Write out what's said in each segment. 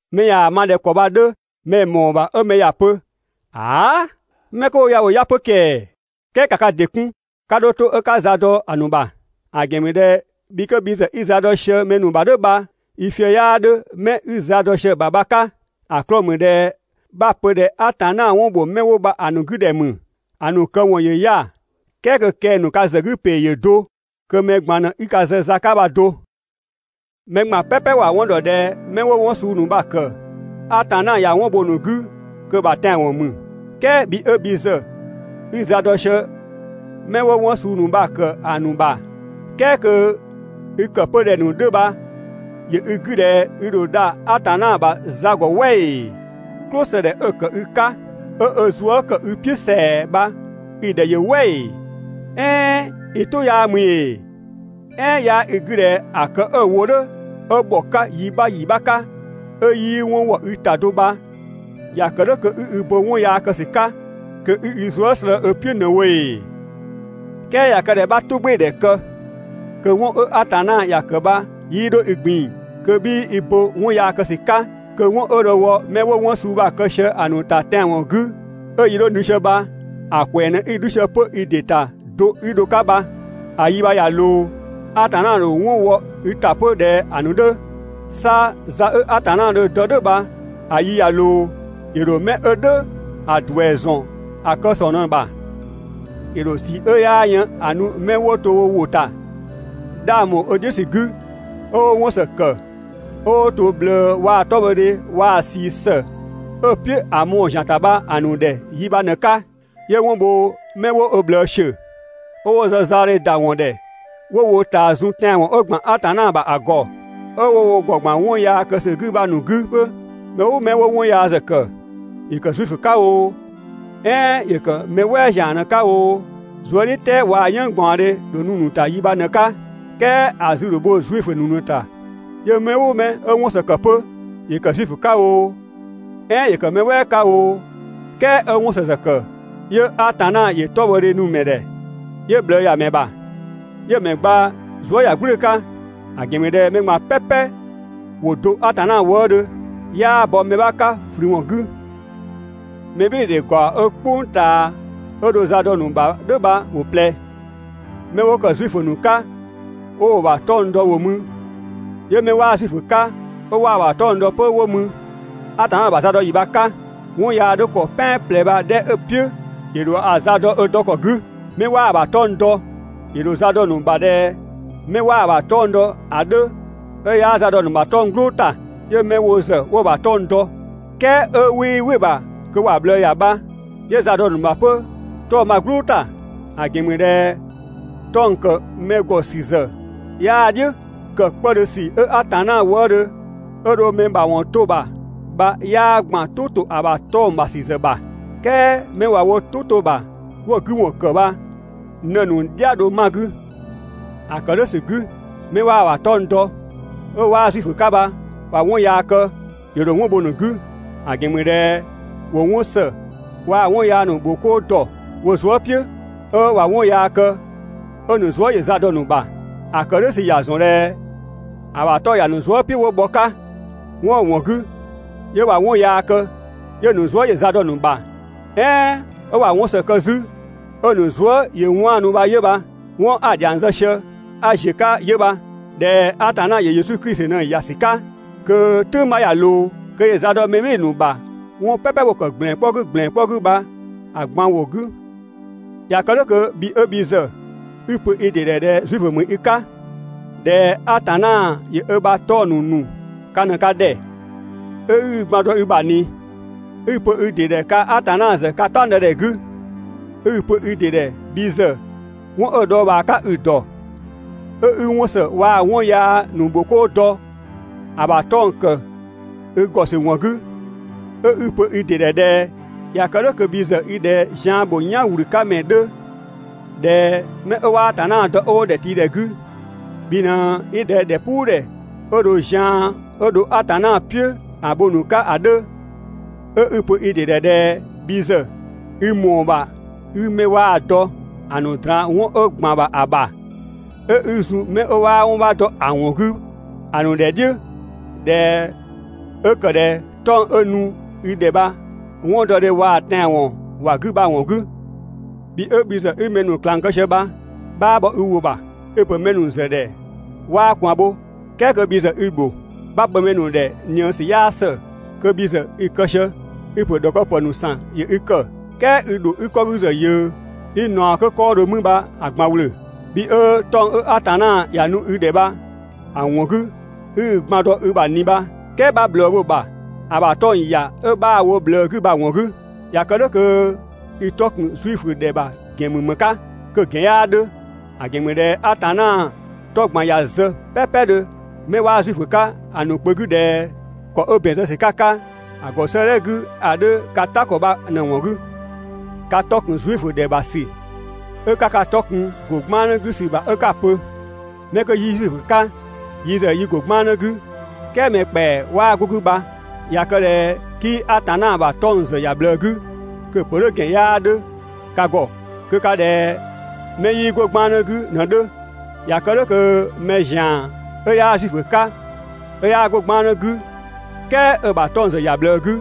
Mɛ ꞊yaa‑ ma ꞊dhɛ ‑kɔ bha‑ 'dhö, mɛ‑ ‑mɔɔ ‑bha 'ö mɛ ‑ya pö: Haa'! 'Mɛ 'kö 'wo ya ‑wo 'ya‑ 'pö ‑kɛɛ!» "Kɛɛ ‑ka ka ‑dɩ 'kun, 'ka 'dho 'to 'ö 'ka za dɔ‑ ‑nu ‑bha. ‑A ‑gɛn ‑mü ꞊dhɛ bhi 'ö bhi ‑zë 'i za dɔ sië mɛ ‑bha "dhʋ̈ bha, i fië‑ 'yaa 'dhö 'mɛ 'i za dɔ sië‑ ‑bha bha‑ 'ka. ‑A 'klɔɔ‑ ‑mü ꞊dhɛ 'bha‑ pö ꞊dhɛ Atanna 'wɔn ‑bho 'mɛ 'wo bha‑ ‑nu 'gü ‑dhɛ ‑mü, ‑a ‑nu këwɔn ‑yö 'ya‑, "kɛɛ kö kɛng‑ ‑nu ka ‑zë 'gü ‑pee ‑yö do, kö mɛ ꞊gban ꞊në 'i ka zë za 'ka bha do. Mɛ ꞊gban "pɛpɛ ‑wa 'wɔn ‑dɔ ꞊dhɛ 'mɛ 'wo 'wɔn suu ‑nu bha‑ ‑kë Atanna ꞊ya 'wɔn bho‑ ‑nu 'gü kö‑ ‑bha tɛanwɔn ‑mü. "Kɛɛ bhi 'ö bhi ‑zë 'i za dɔ sië 'mɛ 'wo 'wɔn suu ‑nu bha‑ ‑kë ‑a ‑nu ‑bha, "kɛɛ kö i‑ ‑kë 'pö ꞊dhɛ‑ ‑nu 'dhö bha ‑yö i 'gü ꞊dhɛ i ‑dho dha Atanna ‑bha za ‑gɔ "wɛ ‑ee? "Klʋsëdhɛ 'ö‑ ‑kë i 'ka, 'ö ö zuë" ‑kë i "piʋ̈ ‑sɛa bha i‑ ‑dhɛ ‑yö "wɛ ‑ee? "Ɛɛn i "tʋ 'yaa ‑mü ‑ee? "Ɛɛn 'yaa i 'gü ꞊dhɛ ‑a kë 'ö‑ wo "dhʋ̈ 'ö ‑bhɔ 'ka yi 'bha ‑yi 'bha 'ka, 'ö 'yii 'wɔn wɔ i ‑ta do bha, ‑ya ‑kë "dhʋ̈ kö 'i i bo 'wɔn yaa kë ‑sü 'ka kö 'i i zuë" slëë‑ ö "piʋ̈ ꞊në‑ wo ‑ee? "Kɛɛ ꞊ya kë ꞊dhɛ 'bha "tʋgbɩɩdhɛ kë, kö 'wɔn 'ö Atanna ‑ya ‑kë bha 'yii 'dho i ꞊gbin‑, kö 'bhii i bo 'wɔn yaa kë ‑sü 'ka, 'kö 'wɔn 'ö dho‑ wɔ 'mɛ 'wo 'wɔn suu bha‑ kë sië bha‑ ‑nu ‑ta tɛanwɔn 'gü, 'ö‑ yi 'dhö nu sië bha‑ ‑kwɛɛ ꞊në 'i 'dhu sië 'pö i ‑dɩ ‑ta do 'i dho‑ 'ka bha. ‑A 'yi bha ꞊ya ꞊loo, Atanna ‑dho 'wɔn wɔ i ‑ta 'pö ꞊dhɛ‑ ‑nu 'dhö. 'Sa za 'ö Atanna dho‑ dɔ "dhʋ̈ bha‑ yi ꞊ya ꞊loo, ‑yö ‑dho mɛ 'ö "dhʋ̈‑ ‑duɛ ‑zɔn ‑a kë ‑sɔng ꞊në‑ ‑bha. ‑Yö ‑dho ꞊sii 'ö 'yaa yën‑ nu 'mɛ 'wo to wo ‑wʋ ‑ta, 'dhang ‑bho ö "dhiʋ̈ ‑sü 'gü, 'ö 'wo 'wɔn ‑së ‑kë, 'ö 'wo to ꞊bhlëë waa‑ 'tɔbhɔdhe waa‑ ꞊sii ‑së 'ö‑ "piʋ̈ ‑a mɔɔ‑ ‑zian ‑ta bha‑ ‑nu ‑dhɛ 'yi bha‑ ꞊në‑ 'ka. 'Yö 'wɔn bho 'mɛ 'wo ö ꞊bhlëë ‑siö, 'ö 'wo zë zaɔdhe ‑da ‑wɔn ‑dhɛ 'wo wo ꞊taa zun tɛanwɔn 'ö ‑gban Atanna ‑bha ‑a ‑gɔ, 'ö 'wo wo ‑gɔ ‑gban 'wɔn yaa kë ‑sü 'gü bha‑ ‑nu 'gü 'pö. Mɛ "ʋʋ 'mɛ 'wo 'wɔn yaa ‑zë ‑kë, ‑yö ‑kë Zuifö 'ka oo, "ɛɛn ‑yö ‑kë mɛ "wɛɛ ‑zian ꞊në‑ 'ka oo, zuëdhiʋ̈tɛɛ waa‑ "yënng ꞊gbaɔndhe ‑dho nu‑ ‑nu ‑ta 'yi bha ꞊në‑ 'ka. "Kɛɛ ‑a 'zü ‑dho bho Zuifö ‑nu ꞊në‑ ‑ta. 'Yö mɛ "ʋʋ mɛ 'ö 'wɔn ‑së ‑kë 'pö, ‑yö ‑kë Zuifö 'ka oo, "ɛɛn ‑yö ‑kë mɛ "wɛɛ 'ka oo, "kɛɛ 'ö 'wɔn ‑së ‑zë ‑kë, 'yö Atanna ‑yö 'tɔbhɔdhe nu‑ ‑mɛ ‑dhɛ, 'yö ꞊bhlëëyamɛ ‑bha, 'yö‑ ‑mɛ gba zuëyagblʋ̈ʋ̈‑ 'ka. ‑A ‑gɛn ‑mü ꞊dhɛ mɛ ꞊gban "pɛpɛ ‑wo do Atanna wëëdhö, 'yaa bɔ mɛ 'bha 'ka ꞊flü ‑wɔn 'gü. (Mɛbhɩɩdhe ‑gaɔ 'ö "kpʋng ꞊taa 'ö dho za dɔ‑ ‑nu ‑bha "dhʋ̈ bha ‑wo ꞊plɛ: Mɛ 'wo ‑kë Zuifö ‑nu 'ka 'ö 'wo‑ ‑bha 'tɔng‑ dɔ ‑wo mü, 'yö 'mɛ 'waa Zuifö 'ka 'ö 'waa‑ ‑bha 'tɔng‑ dɔ 'pö 'wo mü.) Atanna ‑bha za dɔ ‑yi bha‑ 'ka, 'wɔn yaa 'dhö ‑kɔ "pɛan ꞊plɛ bha‑ 'dhɛ 'ö‑ "piʋ̈ ‑yö ‑dho ‑a za dɔ ö dɔ ‑kɔ 'gü. Mɛ 'waa‑ ‑bha 'tɔng‑ dɔ, ‑yö ‑dho za dɔ‑ ‑nu ‑bha ꞊dhɛ 'mɛ 'waa‑ ‑bha 'tɔng‑ dɔ ‑a 'dhö 'ö 'yaa za dɔ‑ ‑nu ‑bha 'tɔng‑ "gblʋʋ ‑ta. 'Yö 'mɛ wo ‑zë 'wo‑ ‑bha 'tɔng‑ dɔ, "kɛɛ 'ö 'wii "wɩ‑ ‑bha kö ‑wa ꞊bhlëë ‑ya bha, 'yö za dɔ‑ ‑nu ‑bha 'pö 'tɔng‑ bha‑ "gblʋʋ ‑ta. ‑A ‑gɛn ‑mü ꞊dhɛ 'tɔng‑ ‑kë mɛ ‑gɔ ‑sü ‑zë 'yaa‑ "dhiʋ̈, ‑kë 'kpëdhö ‑sü 'ö Atanna wëëdhö 'ö dho mɛ ‑mawɔn 'to‑ ‑bha bha 'yaa ‑gban "tʋ ‑to ‑a ‑bha 'tɔng‑ ‑bha ‑sü ‑zë ‑bha, "kɛɛ 'mɛ ꞊wa wo "tʋ 'to‑ ‑bha 'wo‑ 'gü ‑wɔn ‑kë bha ꞊në‑ ‑nu "dhia‑ dho 'ma‑ 'gü. ‑A ‑kë "dhʋ̈ ‑sü 'gü, 'mɛ 'waa‑ ‑bha 'tɔng‑ dɔ, 'ö 'waa Zuifö 'ka bha ꞊wa 'wɔn yaa kë, ‑yö ‑dho 'wɔn bho‑ ‑nu 'gü, ‑a ‑gɛn ‑mü ꞊dhɛ ‑wo 'wɔn ‑së waa‑ 'wɔn yaa ‑nu ‑bho 'koo ‑dɔ wo zuë" "piʋ̈, 'ö ꞊wa 'wɔn yaa kë 'ö‑ ‑nu zuë" ‑yö za dɔ‑ ‑nu ‑bha. ‑A ‑kë "dhʋ̈ ‑sü ‑ya ‑zɔn ꞊dhɛ ‑a ‑bha 'tɔng‑ ‑ya ‑nu zuë" "piʋ̈ 'wo bhɔ‑ 'ka, 'wɔn 'ö‑ ‑wɔn 'gü 'yö ꞊wa 'wɔn yaa kë 'yö‑ ‑nu zuë" ‑yö za dɔ‑ ‑nu ‑bha, "ɛɛn 'ö ꞊wa 'wɔn ‑së kë 'zü, 'ö‑ ‑nu zuë" ‑yö 'waanu bha 'yö bha. 'Wɔn 'a‑ ‑dhiang zë sië 'a ‑ziö 'ka 'yö bha. ꞊Dhɛ Atanna ‑yö Yesu Klisi ꞊në ‑ya ‑sü 'ka, kö "tʋ̈ng 'bha ꞊ya ꞊loo, kö ‑yö za dɔ mɛ "bhɩɩ‑ ‑nu ‑bha 'wɔn "pɛpɛ 'wo‑ ‑kë ‑gblɛn 'kpɔ 'gü ‑gblɛn 'kpɔ 'gü bha‑ ꞊gban ‑wɔn 'gü. ꞊Ya kë "dhʋ̈ kö bhi 'ö bhi ‑zë 'i‑ pö i ‑dɩ ‑dhɛ ꞊dhɛ Zuifö ‑mü i 'ka, ꞊dhɛ Atanna ‑yö ö ‑bha 'tɔng‑ ‑nu ‑nu ka ꞊në ka ‑dhɛ, 'ö 'i i gban dɔ i ‑bha ꞊ni, 'ö 'i‑ pö i ‑dɩ ‑dhɛ kaa‑ Atanna ‑zë ka "taɔngdëdhɛ 'gü, 'ö 'i‑ pö i ‑dɩ ‑dhɛ bhi ‑zë 'wɔn 'ö‑ dhɔɔbhaa 'ka i‑ ‑dɔ, 'ö 'i 'wɔn ‑së waa‑ 'wɔn yaa ‑nu ‑bho 'koo dɔ ‑a ‑bha 'tɔng‑ ‑kë i ‑gɔ ‑sü ‑wɔn 'gü, 'ö 'i‑ pö i ‑dɩ ‑dhɛ ꞊dhɛ ꞊ya kë "dhʋ̈ kö bhi ‑zë i ꞊dhɛ zian ‑bho "yan ꞊wlü 'ka ‑mɛ 'dhö, ꞊dhɛ 'mɛ 'ö 'waa Atanna dɔ 'ö 'wo ‑dhɛtiidhɛ 'gü, bhi ꞊në 'i ꞊dhɛ ‑dhɛpuudhɛ 'ö dho zian 'ö dho Atanna "piʋ̈ ‑a bho‑ ‑nu 'ka ‑a 'dhö, 'ö 'i‑ pö i ‑dɩ ‑dhɛ ꞊dhɛ bhi ‑zë i ‑mɔɔ ‑bha 'i 'mɛ 'waa‑ dɔ ‑a ‑nu ꞊draan 'wɔn 'ö ‑gban ‑bha ‑a ‑bha, 'ö 'i zun 'mɛ 'waa 'wɔn 'bha dɔ‑ ‑wɔn 'gü ‑a ‑nu ‑dhɛ "dhiʋ̈, ꞊dhɛ 'ö ‑kë ꞊dhɛ 'tɔng‑ 'ö‑ nu i ‑dhɛ bha 'wɔndɔdhe waa‑ tɛanwɔn ‑wa 'gü bha‑ ‑wɔn 'gü, bhi 'ö bhi ‑zë 'i mɛ ‑nu ꞊klang kë sië bha, 'bhaa bhɔ i ‑wʋ ‑bha, i‑ ‑pö mɛ ‑nu ‑zë ‑dhɛ 'waa ꞊kwaan bho, "kɛɛ kö bhi ‑zë i‑ ‑bho. 'Bha‑ pö mɛ ‑nu ‑dhɛ ꞊nië ‑sü 'yaa ‑së, kö bhi ‑zë i‑ kë sië. I‑ ‑pö ‑dhɔkëpë ‑nu ‑san ‑yö i ‑kë, "kɛɛ i ‑dho 'i‑ 'kɔ 'gü ‑zë ꞊yʋ̈ʋ̈ 'i ꞊naɔ 'kö 'kɔɔdhö mü bha‑ ꞊gban ‑wlö. Bhi 'ö 'tɔng‑ 'ö Atanna ‑ya nu i ‑dhɛ bha‑ ‑wɔn 'gü 'i i gban dɔ i ‑bha ꞊ni bha, "kɛɛ 'bha ꞊bhlëë bho‑ ‑bha ‑a ‑bha 'tɔng‑ ‑ya 'ö 'bhaa‑ wo ꞊bhlëë 'gü bha‑ ‑wɔn 'gü. ꞊Ya kë "dhʋ̈ kö i 'tɔ ‑kun Zuifö ‑dhɛ ‑bha ‑gɛn ‑mü ‑më 'ka? Kö‑ ‑gɛn 'yaa 'dhö! ‑A ‑gɛn ‑mü ꞊dhɛ Atanna 'tɔ ꞊gban ꞊ya zë "pɛpɛdhö 'mɛ 'waa Zuifö 'ka‑ ‑nu kpö 'gü ꞊dhɛ ‑kɔ 'ö ‑bɛn zë ‑sü 'ka‑ 'ka‑ ‑gɔ 'sëëdhɛ 'gü ‑a 'dhö ka "ta ‑kɔ bha ꞊në‑ ‑wɔn 'gü. Ka 'tɔ ‑kun Zuifö ‑dhɛ ‑bha ‑sü 'ö 'ka ka 'tɔ kun‑ 'ka ‑go 'gbannë 'gü ‑sü ‑bha 'ka‑ pö: 'Mɛ 'kö 'yi Zuifö 'ka yi ‑zë yi ‑go 'gbannë 'gü, "kɛɛ mɛ ‑kpɛa 'waa 'go‑ 'gü bha, ꞊ya kë ꞊dhɛ 'kii Atanna ‑bha 'tɔng‑ ‑zë ‑ya ꞊bhlëë 'gü, kö‑ ‑pö "dhʋ̈ ‑gɛn 'yaa 'dhö ka ‑gɔ. Kö ka ꞊dhɛ 'mɛ 'yii 'go 'gbannë 'gü ꞊në‑ 'dhö. ꞊Ya kë "dhʋ̈ kö mɛ ‑zian 'ö 'yaa Zuifö 'ka 'ö 'yaa 'go 'gbannë 'gü, "kɛɛ 'ö‑ ‑bha 'tɔng‑ ‑zë ‑ya ꞊bhlëë 'gü,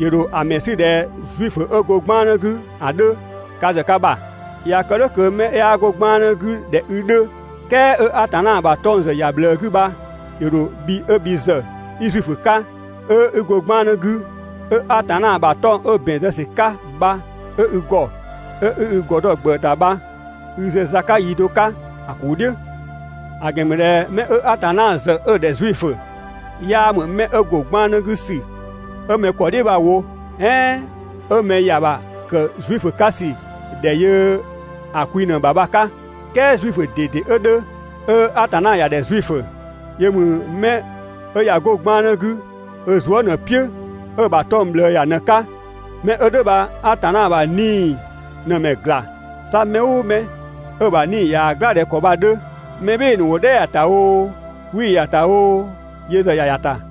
‑yö ‑dho ‑a ‑mɛ 'sü ꞊dhɛ Zuifö 'ö go 'gbannë 'gü ‑a 'dhö (ka ‑zë ka ‑bha). ꞊Ya kë "dhʋ̈ kö 'mɛ 'yaa 'go 'gbannë 'gü ꞊dhɛ i 'dhö, "kɛɛ 'ö Atanna ‑bha 'tɔng‑ ‑zë ‑ya ꞊bhlëë 'gü bha ‑yö ‑dho bhi 'ö bhi ‑zë 'i Zuifö 'ka, 'ö 'i go 'gbannë 'gü, 'ö Atanna ‑bha 'tɔng‑ 'ö ‑bɛn zë ‑sü 'ka bha 'ö i ‑gɔ, 'ö 'i i ‑gɔ dɔ‑ ‑gbëë ‑ta bha i zë za 'ka yi do 'ka‑ ‑kuu "dhiʋ̈. ‑A ‑gɛn ‑mü ꞊dhɛ 'mɛ 'ö Atanna ‑zë 'ö‑ ‑dhɛ Zuifö, 'yaa ‑mü 'mɛ 'ö ‑go 'gbannë 'gü ‑sü 'ö 'mɛ ‑kɔ "dhiʋ̈ bha‑ wo, "ɛɛn 'ö mɛ ‑ya ‑bha ‑kë Zuifö 'ka ‑sü ‑dhɛ yö‑ kwi ꞊në‑ ‑bha bha‑ 'ka. "Kɛɛ Zuifö ꞊dede 'ö 'dhö, 'ö Atanna ‑ya ‑dhɛ Zuifö, yö ‑mü 'mɛ 'ö ꞊ya 'go 'gbannë 'gü ö zuë" ꞊në‑ "piʋ̈, 'ö‑ ‑bha 'tɔng‑ ꞊bhlëë ‑ya ꞊në‑ 'ka. 'Mɛ 'ö "dhʋ̈ bha Atanna ‑bha 'Nii‑ ꞊në‑ ‑mɛ ‑gla, 'sa mɛ "ʋʋ mɛ 'ö‑ ‑bha 'nii‑ ꞊yaa‑ "gla ꞊dhɛ ‑kɔ bha‑ 'dhö, mɛ "bhɩɩ‑ ‑nu ‑wo "dhɛ ‑ya ‑ta oo, 'wii‑ ‑ya ‑ta oo, yö ‑zë ‑ya ‑ya ‑ta.